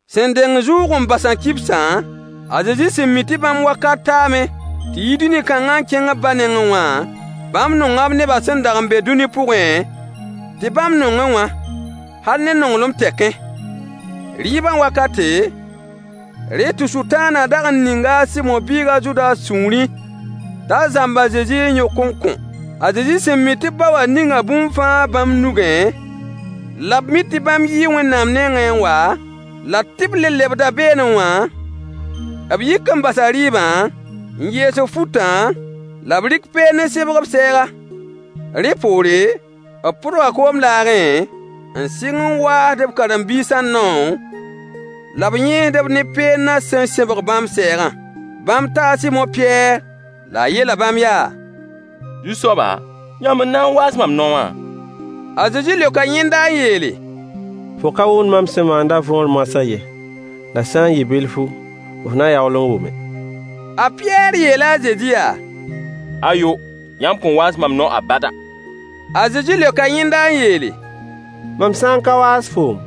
Sẽn deng zʋʋg-n-basã kibsã, a Zezi sẽn mi tɩ bãmb wakat taame tɩ yi dũni kãngã n kẽng b ba nengẽ wã, bãmb nonga b nebã sẽn dag n be dũni pʋgẽ tɩ bãmb nongẽ wã, hal ne nonglem tɛkẽ. Rɩɩbã wakate, rẽ tɩ Sʋtãanã dag n ninga a Sɩmo biig a Zudas sũurẽ t'a zãmb a Zezi n yõk n kõ. A Zezi sẽn mi tɩ b ba wã ninga bũmb fãa bãmb nugẽ, la b mi tɩ bãmb yii Wẽnnaam nengẽ n wa, la tɩ b le lebda beene wã, b yik n basa rɩɩbã, n yees b futã, la b rɩk peend n sẽbg b sɛɛga. Rẽ poore, b pʋdga koom laagẽ, n sɩng n waasd b karen-biisã nao la b yẽesd-b ne peendã sẽn sẽbg bãmb sɛɛgã. Bãmb taa a Sɩmo Pɩyɛɛr, la a yeela bãmb yaa: Zu-soaba, yãmb n na n waas mam nao wã? A Zezi leoka yẽnda n yeele: Fo ka wʋmd mam sẽn maandã võor moasã ye, la sã n yɩ bilfu, f na yaool n wʋme. A Pɩyɛɛr yeela a Zezi yaa: Ayo! Yãmb kõn waas mam nao abada! A Zezi leoka yẽnda n yeele: Mam sã n ka waas foom,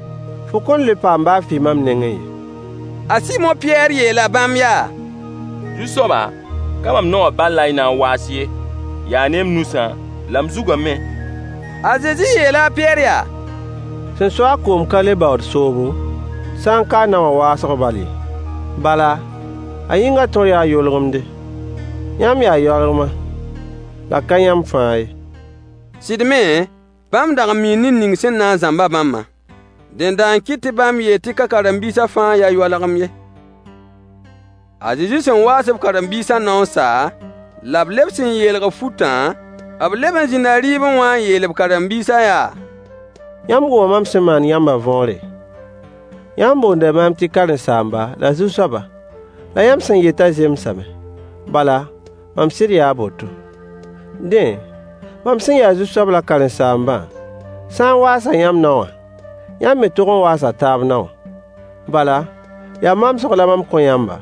fo kõn le paam baa fɩ mam nengẽ ye. A Sɩmo Pɩyɛɛr yeela bãmb yaa: Ka mam nao wã bal la y na n waas ye, yaa ne m nusã la m zugã me. A Zezi yeela a Pɩyɛɛr yaa: Sẽn so-a koom ka le baood soobo, sã n ka nao wã waoosg bal ye. Bala, a yĩngã tõr yaa yolgemde. Yãmb yaa yoalgema, la ka yãmb fãa ye. Sɩd me, bãmb dag n mii ned ning sẽn na n zãmb-a bãmbã. Dẽnda n kɩt tɩ bãmb yeel tɩ ka karen-biisã fãa n ya yoalgem ye. A Zezi sẽn waas b karen-biisã nao n sa, la b lebs n yeelg b futã, b leb n zĩnda rɩɩbẽ wã n yeel b karen-biisã yaa: Yãmb wʋma mam sẽn maan yãmbã võore? Yãmb boonda maam tɩ karen-saamba la Zu-soaba, la yãmb sẽn yetã zemsame, bala, mam sɩd yaa a boto. Dẽ, mam sẽn ya Zu-soab la Karen-saambã sa n waasa yãmb nao wã, yãmb me tog n waasa taab nao wã. Bala, yaa mamsg la mam kõ yãmba,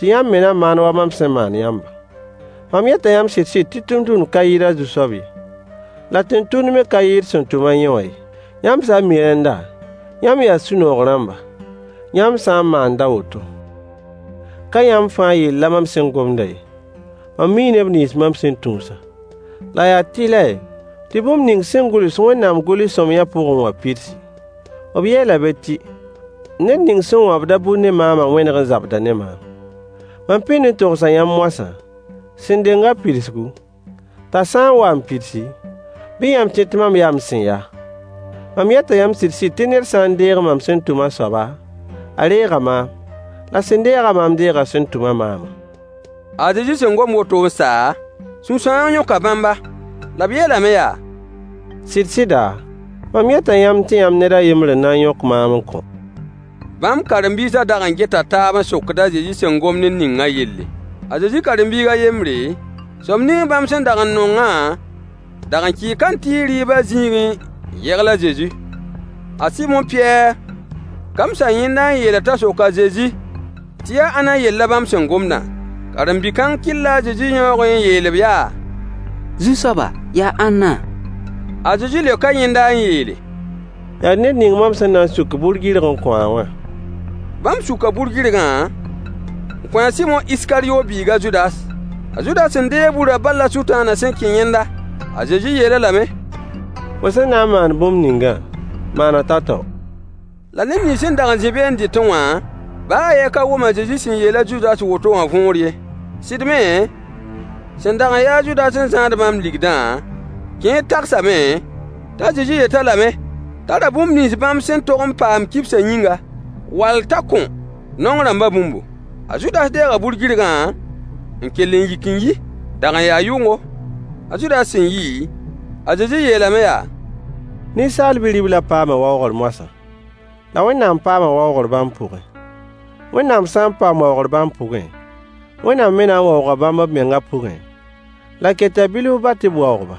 tɩ yãmb me na maan wa mam sẽn maan yãmbã. Mam yeta yãmb sɩd-sɩd tɩ tʋmtʋmd ka yɩɩd a zu-soab ye, la tẽn-tʋmd me ka yɩɩd sẽn tʋm-a yẽ wã ye. Yãmb sã n mi rẽnda, yãmb yaa sũ-noog rãmba, yãmb sã n maand a woto. Ka yãmb fãa yell la mam sẽn gomdã ye. Mam mii neb nins mam sẽn tũusã. La yaa tɩlɛ tɩ bũmb ning sẽn gʋls Wẽnnaam gʋls-sõamyã pʋgẽ wã pidsi. B yeela be tɩ: “Ned ning sẽn wãbd-a bur ne maamã wẽneg n zabda ne maam.” Mam pĩnd n togsa yãmb moasã, sẽn deng a pidsgu, t'a sã n wa n pidsi, bɩ yãmb tẽ tɩ mam yaa m sẽn ya. Mam yeta yãmb sɩd-sɩd tɩ ned sã n deeg mam sẽn tʋm a soaba, a reega maam, la sẽn deeg-a maam deega sẽn tʋm-a maamã. A Zezi sẽn gom woto n sa, sũ-sãoong yõka bãmba, la b yeelame yaa: Sɩd-sɩda, mam yeta yãmb tɩ yãmb ned a yembr n na n yõk maam n kõ. Bãmb karen-biisã dag n geta taab n sokd a Zezi sẽn gomd ned ningã yelle. A Zezi karen-biig a yembre, soab ning bãmb sẽn dag n nongã dag n kɩɩ kãntɩɩg rɩɩbã zĩigẽ n yegl a Zezi. A Sɩmo Pɩyɛɛr kamsa yẽnda n yeel-a t'a sok a Zezi tɩ yaa ãnna yell la bãmb sẽn gomdã. Karen-bi-kãng kɩlla a Zezi yãoogẽ n yeel-b yaa: Zu-soaba, yaa ãnna? A Zezi leoka yẽnda n yeele: Yaa ned ning mam sẽn na n suk bur-gɩrg n kõ-a wã. Bãmb suka bur-gɩrgã n kõ Iskaryo Sɩmo biig a Zudas. A Zudas sẽn deeg burã bal la Sʋtãanã sẽn kẽ yẽnda. A Zezi yeel-a lame: Fo sẽn na n maan bũmb ningã, maan-a tao-tao. La neb nins sẽn dag n zĩ be n dɩtẽ wa, baa a yen ka wʋm a Zezi sẽn yeel a Zudas woto wã võor ye. Sɩd me, sẽn dag n ya a Zudas n zãad bãmb ligdã, kẽer tagsame t'a Zezi yet-a lame t'a ra bũmb nins bãmb sẽn tog n paam kibsã yĩnga, wall t'a kõ naong rãmbã bũmbu. A Zudas deega bur-gɩrgã n kell n yik n yi. Dag n yaa yʋngo. A Zudas sẽn yi, a Zezi yeelame yaa: Ninsaal bi-riblã paama waoogr moasã, la Wẽnnaam paama waoogr bãmb pʋgẽ. Wẽnnaam sã n paam waoogr bãmb pʋgẽ, Wẽnnaam me na n waooga bãmb b mengã pʋgẽ, la keta bilf bal tɩ b waoog-ba.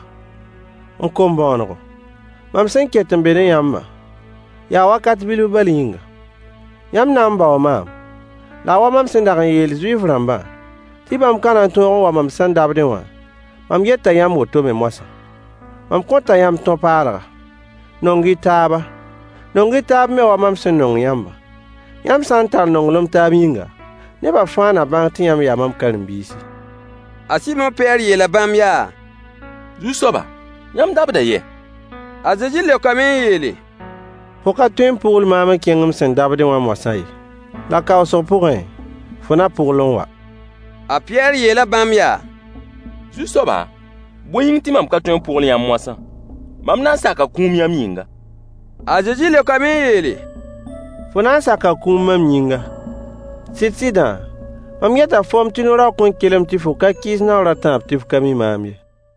M kom-bõonego, mam sẽn ket n be ne yãmbã, yaa wakat bilf bal yĩnga. Yãmb na n baoo maam, la a wa mam sẽn dag n yeel Zuif-rãmbã tɩ bãmb ka na n tõog n wa mam sẽn dabdẽ wã, mam yeta yãmb woto me moasã. Mam kõta yãmb tõ-paalga: Nong-y taaba. Nong-y taab me wa mam sẽn nong yãmbã. Yãmb sã n tall nonglem taab yĩnga, nebã fãa na bãng tɩ yãmb yaa mam karen-biisi. A Sɩmo Pɩyɛɛr yeela bãmb yaa: Zu-soaba, yãmb dabda yɛ? A Zezi leokame n yeele: Fo ka tõe n pʋgl maam n kẽng m sẽn dabdẽ wã moasã ye, la kaoosg pʋgẽ, fo na pʋgl n wa. A Pɩyɛɛr yeela bãmb yaa: Zu-soaba, bõe yĩng tɩ mam ka tõe n pʋgl yãmb moasã? Mam na n saka kũum yãmb yĩnga. A Zezi leokame n yeele: Fo na n saka kũum mam yĩnga. Sɩd-sɩdã, mam yeta foom tɩ no-raoog kõn kelem tɩ fo ka kɩɩs naoor a tãab tɩ f ka mi maam ye.